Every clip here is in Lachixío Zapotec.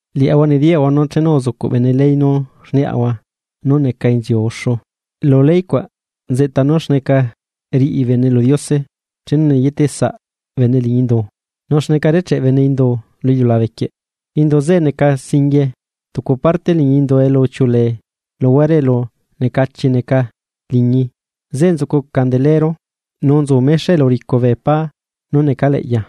Liaꞌahua nediyaꞌahua nú chenu uzucuꞌ bene ley nú rniaꞌahua nú neca inziu uxu, lu ley cuaꞌ nzeꞌta nú xneca riꞌi bene lu Diose chenu neyeteꞌ saꞌbene liñi indu, nu xneca recheꞌ bene indu lu iliulabequie. Indu zeꞌe neca singuie tucu parte liñii elu uchiuꞌulee luhuare elu necachi neca, liñii zeꞌe nzucu candelero, nu nzu mexa elu uricu bee pá nú necaleꞌya.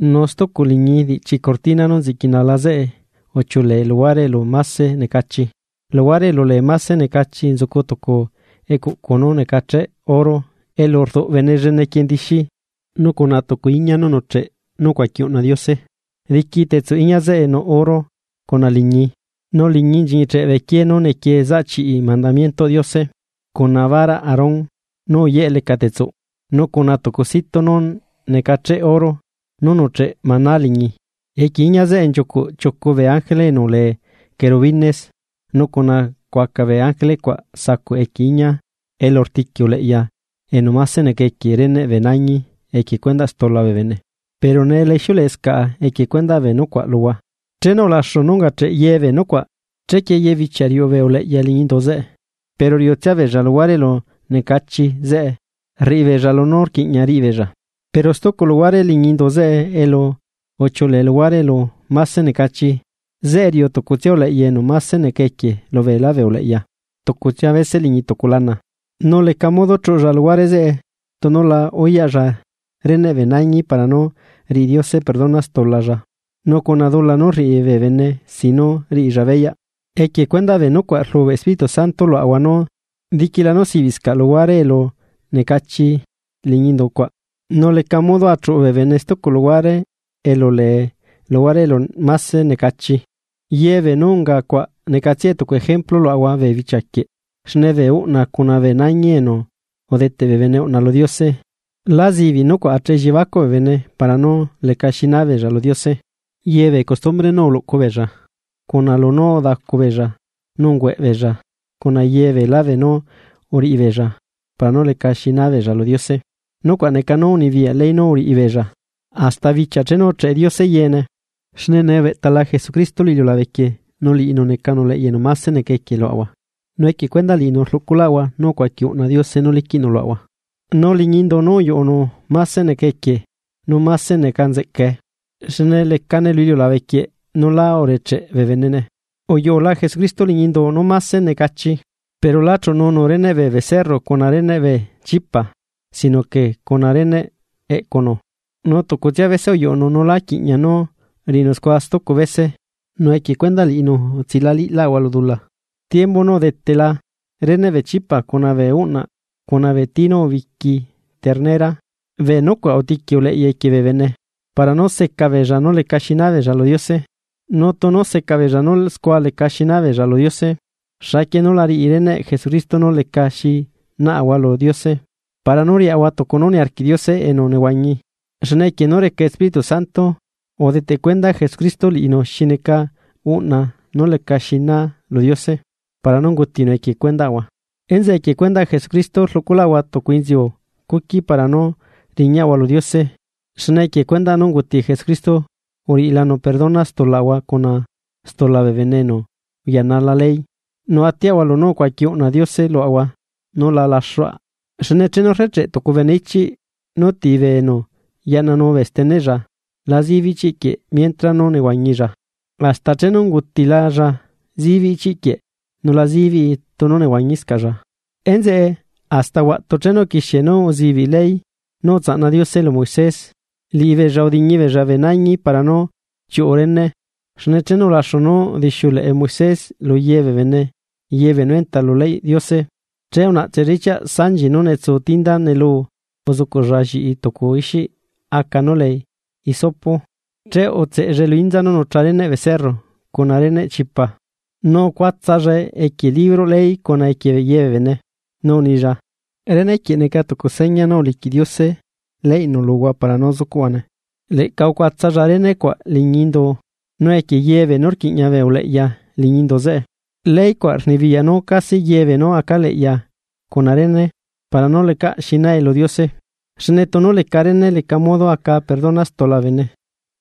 Nu stucu liñii diꞌchi cortina nú nziꞌquinala zeꞌe uchiuꞌulee luhuare elu máse necachi; luhuare elu lee máse necachi nzucu tucu ecuꞌcu nú necacheꞌ oro elu rduꞌbene lleneꞌ quie ndixi nu cuna tucu iña nú nuꞌcheꞌ nú ucuaqui uꞌna Diose. Diqui tetsuꞌ iñia zeꞌe nuꞌ oro cuna liñii. Nu liñii nchiñicheꞌ bee quiee nú nequie zaꞌ chiꞌi mandamientoꞌ Diose lu cuna baraꞌ Aarón nú uyeꞌ lecatetsuꞌ, nu cuna tucu situ nú necacheꞌ oro nú nuꞌcheꞌ maná liñi. Equie iñia zeꞌe nchiucuꞌ chiucu bee ángele enu lee querubines nu cuna cuaca bee ángele cuaꞌ sacuꞌ equie iñia elu rtiqui uleꞌya enu máse neca equie reneꞌ bee nañi equie cuendaꞌ stula bee bene. Pero nee la ixiuleꞌescaꞌa equie cuendaꞌ bee nucuaꞌ luhua. Chenu ulaxu nú ungacheꞌ yebee nucuaꞌ chequie ye bichia riuꞌu bee uleꞌya liñi indu zeꞌe pero riuꞌutsia beella luhuare elu necachi zeꞌe rriꞌibeella lunú rquiꞌña riꞌibeella. Pero stucu luhuare liñi indu zeꞌe elu uchiuꞌulee luhuare elu máse necachi zeꞌe riuꞌu tucutsia uleꞌya enu máse neca equie lubeelá bee uleꞌya tucutsia bese liñi tucu lana. Nu leca modo chuꞌulla luhuare zeꞌe tunu la uyaꞌlla reneꞌ bee nañi para nú riꞌi Diose perdona stulalla nu cuna dula nu rriꞌi bee bene sin nú riꞌilla beyaꞌ. Equie cuendaꞌ bee nucuaꞌ rlubeꞌ Espíritu Santo luaꞌahua nú diquila nú sibiꞌscaꞌ luhuare elu necachi liñi indu cuaꞌ, nu leca modo achuꞌu bee bene stucu luhuare elu lee luhuare elu máse necachi. Ye beenú unga cuaꞌ necatsia tucu ejemplu luaꞌahua bee bichia quieꞌ xne bee uꞌna cuna bee nañi enu udeteꞌ bee bene uꞌna lu Diose, lá zibiꞌ nucuaꞌ acheꞌe elliebacuꞌ bee bene para nú leca xinaa beella lu Diose. Ye bee costumbre nú uluꞌcu beella, cuna lunú udacubeella, nu ungueꞌbeella cuna ye beela beenú uriꞌibeella para nú leca xinabeella lu Diose, nucuaꞌ neca nú unibiyaꞌ ley nú uriꞌi beella, hasta bichia chenu ucheꞌe Diose yeene. Xne nee ubeꞌtala Jesucristo lu iliulabe quieꞌ nu liꞌinu necanu uleꞌya enu máse neca equie luaꞌahua, nu equie cuendaꞌ liꞌinu rluꞌculaꞌahua nu ucuaqui uꞌna Diose nú liquiꞌnu luaꞌahua. Nu liñi indu nú uyuꞌunu máse neca equie, nu máse neca nzeꞌcae, xne lecane lu iliulabe quieꞌ nu lá urecheꞌ bee benene. Uyuꞌula Jesucristo liñi indu nú máse necachi, pero lá chuꞌununu reneꞌ bee becerro cuna reneꞌ bee chipa, sino que cuna reneꞌ eꞌcunu. Nu tucutsia bese uyuꞌunu nu lá quiꞌña nú riꞌinu scua stucu bese nu equie cuendaꞌ liꞌinu utsilaꞌaliꞌlaꞌahua lu dula. Tiembu nú udetela, reneꞌ bee chipa cuna bee uꞌna cuna bee tii nú ubiqui ternera bee nucuaꞌ utiqui uleꞌya equie bee bene, para nú seca beella nú lecaxi naabeella lu Diose. Nu tunu seca beella nú scua leca xinabeella lu Diose. Xaquie núla riꞌi reneꞌ Jesucristo nú lecaxi naꞌahua lu Diose, para nú riaꞌahua tucu nú niarquiꞌ Diose enu nehuañi, xne equie nú reca Espíritu Santo, udeteꞌ cuenda Jesucristo liꞌinu xi neca uꞌna nú lecaxi na lu Diose para nú ungutinu equie cuendaꞌahua. Enzeꞌe equie cuendaꞌ Jesucristo rluꞌculaꞌahua tucu inziu cuqui para nú riñaꞌahua lu Diose. Xne equie cuendaꞌ nú unguti Jesucristo uriꞌilanu perdona stulaꞌahua cuna stula bee bene enu uyanala ley, nu atiaꞌahua lunú ucuaqui uꞌna Diose luaꞌahua nú la laxuaꞌ. Xne chenu recheꞌ tucu bene ichiꞌ nú ti bee enu yaꞌnanu bee steneꞌlla, la zibiꞌ ichiꞌ quieꞌ mientra nú nehuañilla, hasta chenu ungutilalla zibiꞌ ichiꞌ quieꞌ nu la zibii tunu nehuañiscaꞌlla. Enzeꞌe, hasta huaꞌtu chenu uquixie nú uzibiꞌ ley nú utsaꞌna Diose lu Moisés, liꞌibeella udiñibeella bee nañi para nú chiuꞌu rene. Xne chenu ulaxu nú udixiuleꞌe Moisés luye bee bene yebeenú enta lu leyꞌ Diose, che unaꞌtsella ichiaꞌ sanchi nú netsuu tinda nelu uzucuꞌlla lliꞌi tucu ixiꞌ aca nú lee hisopo. Che utseꞌellae lu inza nú nucha reneꞌ becerro cuna reneꞌ chipa, nu ucuatsallae equie libro ley cuna equie ye bee bene. Nu unilla: “Rene quieꞌ neca tucu seña nú uliquiꞌla Diose leyꞌnu luhua para nú zucuꞌhuane.” Leꞌca ucuatsalla rene cuaꞌ liñi indu nu equie yebee nú rquiꞌña bee uleꞌya liñi indu zeꞌe. Ley cuaꞌ rnibiyaꞌ nú casi yebee nú aca leꞌya cuna rene para nú lecaꞌ xi nae lu Diose, xne tunu leca rene leca modo aca perdona stula bee bene.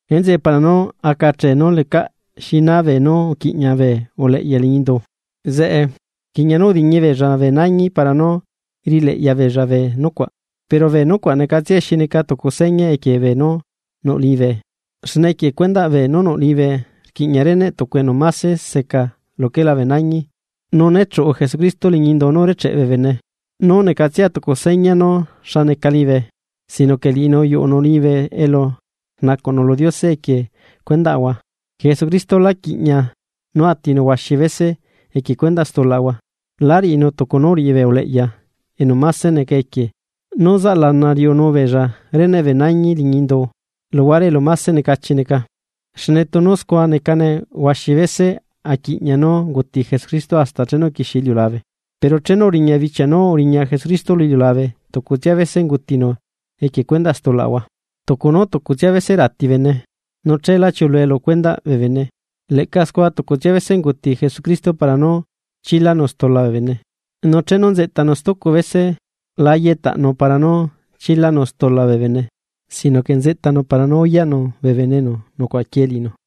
Enzeꞌe, para nú aca achee nú lecaꞌ xina beenú uquiꞌña bee uleꞌya liñi indu zeꞌe, rquiꞌña nú udiñi beella bee nañi para nú riꞌileꞌya beella bee nucuaꞌ. Pero bee nucuaꞌ necatsiae xi neca tucu seña equie beenú nuꞌ liñibe, xne equie cuendaꞌ bee nú nuꞌ liñibe rquiꞌña reneꞌ tucu enu máse seca luquela bee nañi. Nu néchuꞌu Jesucristo liñi indu nú urecheꞌe bee bene, nú necatsia tucu seña nú xa neca liñibe, sino que liꞌinu uyuꞌunu liñibe elu rnacuꞌnu lu Diose equie cuendaꞌahua. Jesucristo la quiꞌña nú atinu huaxi bese equie cuendaꞌ stulaꞌahua, lá riꞌinu tucu nú uriꞌi bee uleꞌya enu máse neca equie nú zaꞌlana riuꞌunu beella reneꞌ bee nañi liñi indu, luhuare elu máse necachi neca. Xne tunu scua necane huaxi bese aquiꞌña nú unguti Jesucristo hasta chenu uquixie iliulabe. Pero chenu uriña bichia nú uriña Jesucristo lu iliulabe tucutsia bese ungutinu equie cuendaꞌ stulaꞌahua. Tucu nú tucutsia bese rati bene, nu chela chiulue lu cuendaꞌ bee bene. Leꞌca scua tucutsia bese unguti Jesucristo para nú chilanu stula bee bene. Nu chenu nzeꞌtanu stucu bese, la yeꞌtaꞌnu para nú chilanu stula bee bene, sino que nzeꞌtanu para nú uyaꞌnu bee bene enu nucuaꞌaquiee liꞌinu.